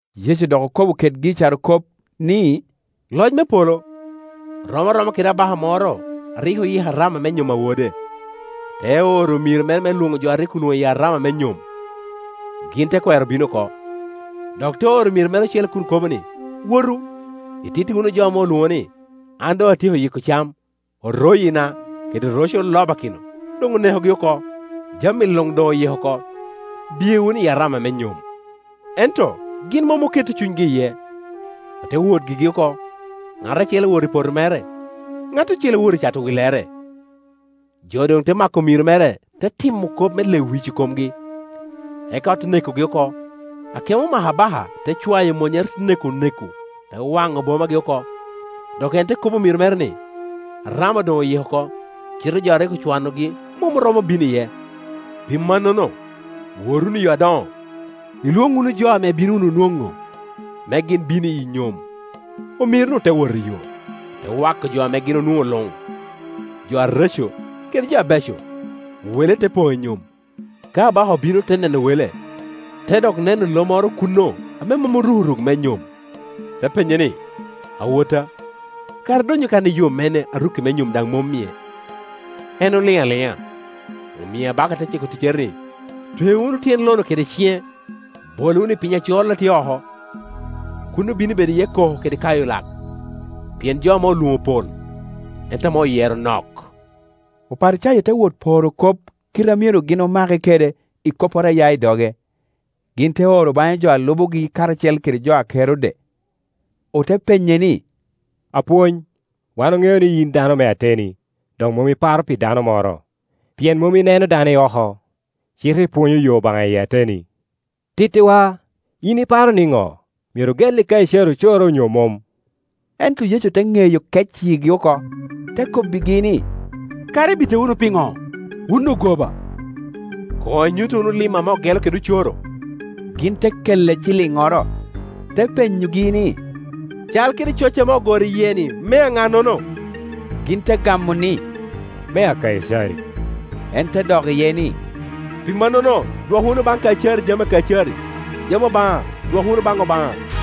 Yecu dok okobo kedgi i carokop, ni, “Loc me polo rom aroma kede abaka moro a rik oyiko arama me-nyom a wode te oro omiro mere me lwoŋo jo a rik olwoŋo i arama me nyom, gin te kwero bino oko. Dok te oro omiro ocele kun kobo ni, ‘Wotu, ititti wunu jo ame olwoŋo ni, An doŋ atyeko yiko cam, oroyina kede roce olobakino doŋ onekogi oko, jami luŋ doŋ oyiko oko; biye wunu i arama me nyom.’ Ento gin mom oketo cunygi iye, ote wot gigi oko; ŋat acel owoto i poto mere, ŋat ocele owoto i cato willere, jo doŋ te mako omiro mere, te timo kop me lewic I komgi, eka ote nekogi oko. Akemo omako abaka te cwayo monnyere, te neko onek-ku, te waŋo bomagi oko. Dok en te kobbi omiro mere ni, ‘Arama doŋ oyiko oko, cite jo a rik ocwanogi mom oromo bino iye. Pi mannono wot wunu i yo adoŋo, ilwoŋ wunu jo ame ibino wunu nwoŋo, me gin bin i nyom.’ Omiro-nu te wot iyo, ote wako jo ame gin onwoŋo luŋ, jo areco kede jo abeco, wele te poŋ i nyom. “Ka abaka obino me neno wele te dok neno lo moro kuno ame mom oruko ruk me nyom. Te penye ni ‘Awotta, kara idonyo kan i yo mene ame rukki me nyom daŋ mom-mie?’ En oliŋ aliŋa. Omio abaka te ciko oticcere ni, ‘Twe wunu tyen lo-nu kede ciŋe, bole wunu i piny acol a tye oko; kuno bino bedo iye koko kede kayo lak.’ Pien jo ame olwoŋo pol, ento ame oyero nok.” Oparicayo te wot poro kop kite a myero gin omake kede i kopporo a ya i doge. Gin te oro baŋe jo a lubogi karacel kede jo a Kerode, ote penye ni, “Apwony, wan oŋeo ni yin dano me ateni, dok mom iparo pi dano moro pien mom ineno dano i oko cite ipwonyo yo Obaŋa i ateni. Tittiwa in iparo niŋo, myero ogelli Kaicari ocoro onyo mom?” Ento Yecu te ŋeyo kec yigi oko, te kobbigi ni, “Kara ibita wunu piŋo, wun ogoba? Koŋ inyutta wunu lim ame ogelo kede ocoro.” Gin te kelle ciliŋŋoro. Te penyogi ni, “Cal kede coc ame ogoro lye-ni mea ŋa-nono?” Gin te gamo ni, “Mea Kaicari.” En te dok iye ni, “Pi mannono dwok wunu baŋ Kaicari jami a Kaicari, jami Obaŋa dwok wunu baŋ Obaŋa.”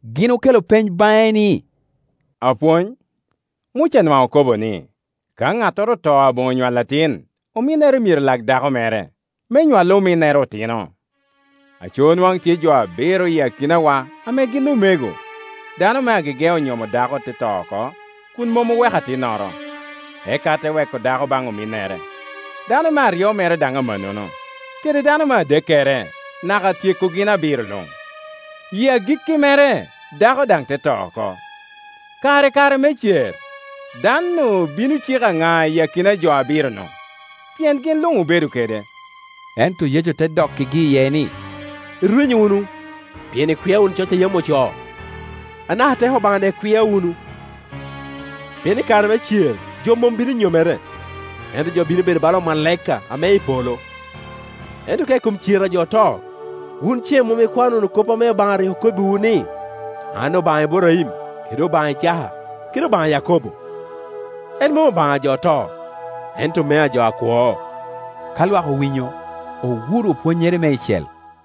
Gin okelo peny baŋe ni, “Apwony, Muca nwaŋ okobo ni, ka ŋattoro oto aboŋo nywalo atin, ominnere myero lak dako mere, me nywal ominnere otino. Aco, nwaŋ tye jo abiro i akinawa ame gin omego. Dano me agege onyomo dako te to oko kun mom oweko atinnoro, eka te weko dako baŋ ominnere. Dano me aryo mere daŋ amannono, kede dano me adekkere, naka tyeko gin abiro luŋ. I agikki mere dako daŋ te to oko. Kara i kare me cer, dan-nu bino cik aŋa i akina jo abiro-nu? Pien gin luŋ obedo kede.” Ento Yecu te dokkigi iye ni, “Irwenyo wunu, pien ikwia wunu coc yam ocoo, anaka teko Obaŋa daŋ ikwia wunu. Pien i kare me cer jo mom bino nyomere, ento jo bino bedo bala omalaika ame i polo. Ento ka i kom cer a jo oto, wun ce mom ikwano wunu kop ame Obaŋa rik okobbiwu ni, ‘An Obaŋa Iburaim, kede Obaŋa Icaka, kede Obaŋa a Yakobo?’ En mom Obaŋa ajo oto, ento mea jo akwo.” Ka lwak owinyo, owuro pwonnyere meicel.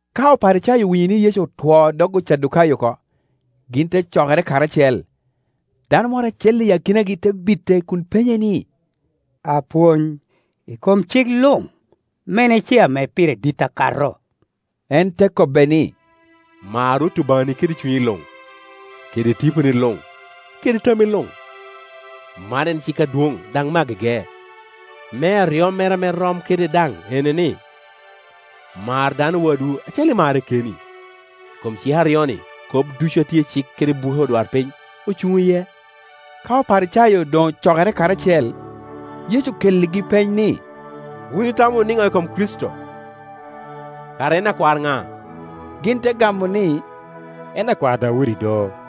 Ka Oparicayo owinyo ni Yecu otwoo dog Ocadukayo oko, gin te cokere karacel. Dano moro acel i akinagi te bite kun penye ni, “Apwony, i kom cik luŋ, mene ce ame pire dit akato?” En te kobbe ni, “Mar Rwot Obaŋani kede cunyi luŋ, kede tiponi lung, kede tammi luŋ. Man en cik adwoŋ, daŋ me agege. Me aryo mere ame rom kede daŋ ene, ni, Mar dano wadwu acalo imarre keni. I kom cik aryo-ni kop ducu a tye Cik kede buke odwarpiny ocuŋ iye.” Ka Oparicayo doŋ ocokere karacel Yecu okelligi peny ni, “Wun itamo wunu niŋo i kom Kricito? Kara en akwar ŋa?” Gin te gamo ni, “En akwar Daudi do.”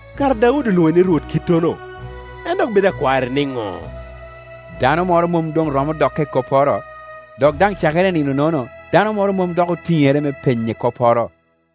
Kara Daudi olwoŋe ni Rwot kittono, en dok bedo akwarre niŋo?” Dano moro mom doŋ romo dokke i kopporo, dok daŋ cakere i nino-nono dano moro mom dok otiŋere me penye kopporo.